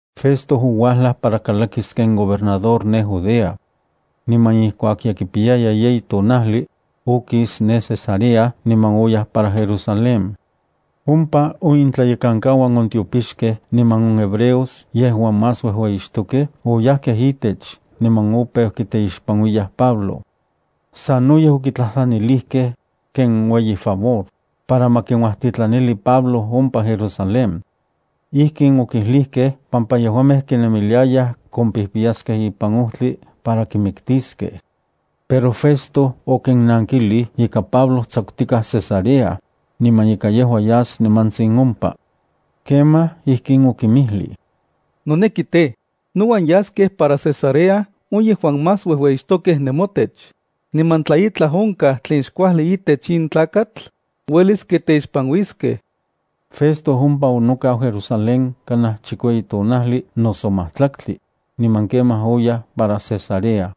Festo ouajlaj para kalakis ken gobernador ne Judea. Niman ijkuak ye kipiyaya yeyi tonajli, okis ne Cesarea niman oyaj para Jerusalén. Ompa on intlayekankauan on tiopixkej niman on hebreos yejuan más uejueyixtokej oyajkej itech niman opeu kiteixpanuiyaj Pablo. Sanoyej okitlajtlanilijkej, ken ueyi favor, para ma kinuajtitlanili Pablo ompa Jerusalén. Ijkin okijlijkej pampa yejuamej kinemiliayaj kompijpiyaskej ipan ojtli para kimiktiskej. Pero Festo okinnankilij ika Pablo tsakutikaj Cesarea, niman ika yejua yas nimantsin ompa. Kemaj, ijkin okinmijlij: —Noneki tej, nouan yaskej para Cesarea on yejuan más uejueyixtokej nemotech, niman tla itlaj onkaj tlen xkuajli itech on tlakatl, uelis kiteixpanuiskej. Festo ompa onokau Jerusalén kanaj chikueyi tonajli noso majtlaktli, niman kemaj oyaj para Cesarea.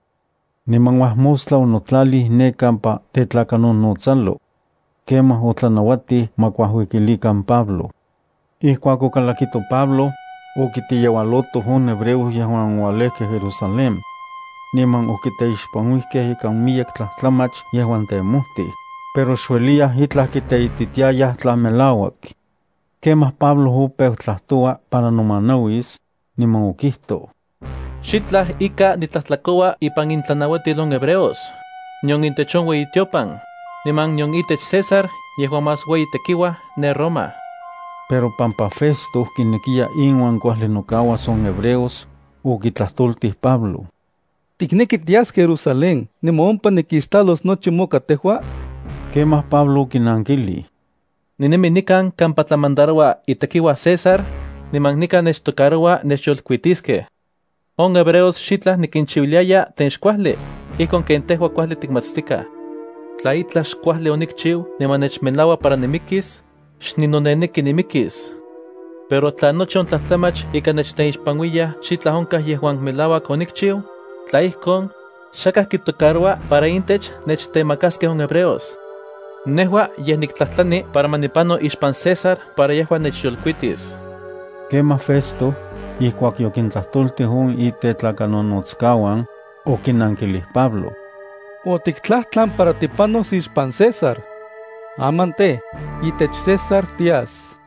Niman uajmostla onotlalij ne kampa tetlakanonotsalo. Kemaj otlanauatij ma kuajuikilikan Pablo. Ijkuak okalakito Pablo, okiteyeualotoj on hebreos yejuan oualejkej Jerusalén. Niman okiteixpanuijkej ikan miyek tlajtlamach yejuan temojtij, pero xueliyaj itlaj kiteititiayaj tla melauak. Kemaj Pablo opeu tlajtoua para nomanauis, niman okijtoj: —Xitlaj ika nitlajtlakoua ipan intlanauatil on hebreos, nion itech on ueyitiopan, niman nion itech César yejuan más ueyi tekiuaj ne Roma. Pero pampa Festo kinekiya inuan kuajli nokauas on hebreos, okitlajtoltij Pablo: —¿Tikneki tias Jerusalén niman ompa nikixtlalos nochi moka tejua? Kemaj Pablo okinankilij: —Ninemi nikan kampa tetlamandaroua itekiuaj César, niman nikan nechtocaroua nechyolkuitiskej. On hebreos xitlaj nikinchiuiliaya tlen xkuajli, ijkon ken tejua kuajli tikmatstikaj. Tla itlaj xkuajli onikchiu niman nechmelaua para nimikis, xninoneneki nimikis. Pero tla nochi on tlajtlamach ika nechteixpanuiyaj xitlaj onkaj yejuan melauak onikchiu, tla ijkon, xakaj kitocaroua para intech nechtemakaskej on hebreos. Nejua yej niktlajtlani para ma nipano ixpan César para yejua nechyolkuitis. Kemaj Festo, ijkuak yokintlajtoltij on itetlakanonotskauan, okinankilij Pablo: —Otiktlajtlan para tipanos ixpan César. Aman tej, itech César tias.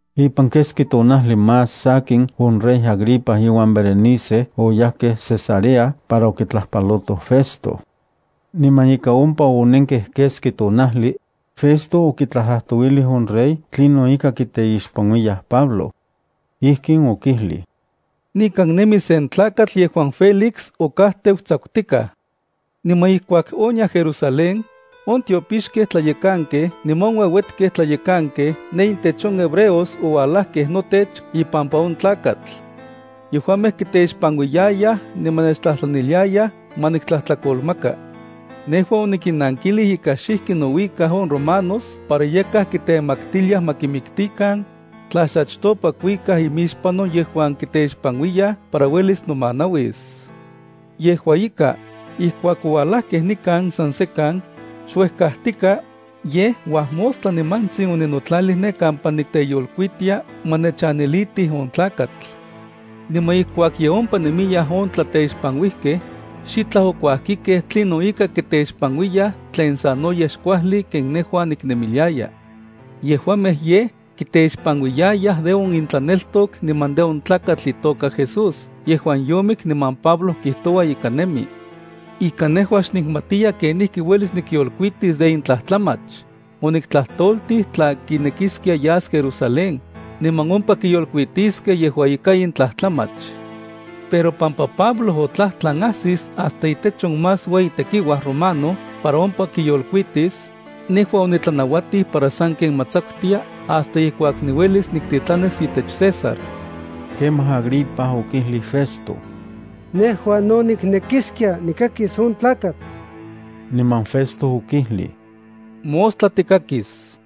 Ipan keski tonajli más sakin on rey Agripa iuan Berenice oyajkej Cesarea para okitlajpalotoj Festo. Niman ika ompa onenkej keski tonajli, Festo okitlajtlajtouilij on rey tlinon ika kiteixpanuiyaj Pablo. Ijkin okijlij: —Nikan nemi sen tlakatl yejuan Félix okajteu tsakutikaj. Niman ijkuak oniaj Jerusalén, on tiopixkej tlayekankej niman on ueuetkej tlayekankej ne intech on hebreos oualajkej notech ipampa on tlakatl. Yejuamej kiteixpanuiyayaj niman nechtlajtlaniliayaj ma niktlajtlakolmaka. Nejua onikinnankilij ika xijki nouikaj on romanos para yakaj kitemaktiliaj ma kimiktikan, tla xchatopa kuikaj imixpan on yejuan kiteixpanuiyaj para uelis nomanauis. Yejua ika, ijkuak oualajkej nikan san sekan, xuejkajtikaj, yej uajmostla nimantsin oninotlalij ne kampa niteyolkuitia niman onitlanauatij ma nechanilitij on tlakatl. Niman ijkuak ye ompa nemiyaj on tlateixpanuijkej, xitlaj okuajkikej tlinon ika kiteixpanuiyaj tlen sanoyej xkuajli ken nejua niknemiliaya. Yejuamej yej kiteixpanuiyayaj de on intlaneltok niman de on tlakatl itoka Jesús yejuan yomik niman Pablo kijtoua ika nemi. Ika nejua xnikmatiya kenijki uelis nikyolkuitis de in tlajtlamach, oniktlajtoltij tla kinekiskia yas Jerusalén, niman ompa kiyolkuitiskej yejua ika in tlajtlamach. Pero pampa Pablo otlajtlan ajsis hasta itech on más ueyi tekiuaj romano para ompa kiyolkuitis, nejua onitlanauatij para sanken ma tsakutia hasta ijkuak niuelis niktitlanis itech César. Kemaj Agripa okijlij Festo: —Nejua no niknekiskia nikakis on tlakatl. Niman Festo okijlij: —Mostla tikakis.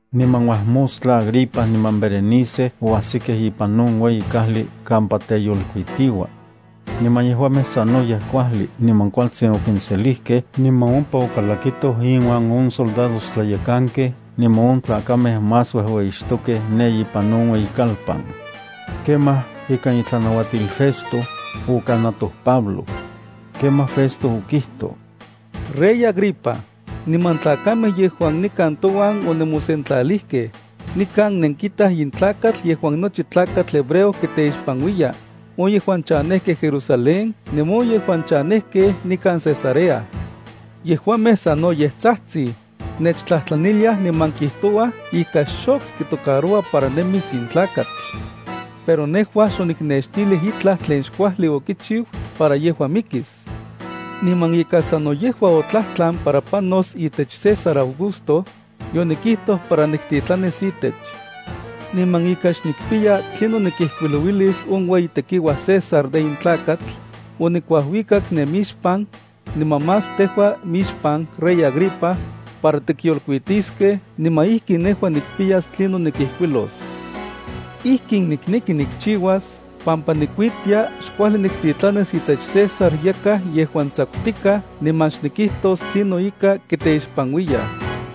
Niman uajmostla Agripa niman Berenice oajsikej ipan on ueyi kajli kampa teyolkuitiua. Niman yejuamej sanoyej kuajli niman kualtsin okinselijkej niman ompa okalakitoj inuan on soldadojtlayekankej niman on tlakamej más uejueyixtokej ne ipan on ueyikalpan. Kemaj ikan itlanauatil Festo, okanatoj Pablo. Kemaj Festo okijtoj: —Rey Agripa, niman tlakamej yejuan nikan touan onemosentlalijkej, nikan nenkitaj in tlakatl yejuan nochi tlakatl hebreo kiteixpanuiya, on yejuan chanejkej Jerusalén niman on yejuan chanejkej nikan Cesarea. Yejuamej sanoyej tsajtsij, nechtlajtlaniliaj niman kijtouaj ika xok kitocaroua para nemis in tlakatl. Pero nejua xoniknextilij itlaj tlen xkuajli okichiu para yejua mikis. Niman ika sano yejua otlajtlan para panos itech César Augusto, yonikijtoj para niktitlanis itech. Niman ika xnikpiya tlinon nikijkuilouilis on toueyi tekiuaj César de in tlakatl, onikuajuikak nemixpan, niman más tejua mixpan, rey Agripa, para tikyolkuitiskej niman ijki nejua nikpiyas tlinon nikijkuilos. Ijkin nikneki nikchiuas pampa nikuitia xkuajli niktitlanis itech César yakaj yejuan tsakutikaj niman xnikijtos tlinon ika kiteixpanuiyaj.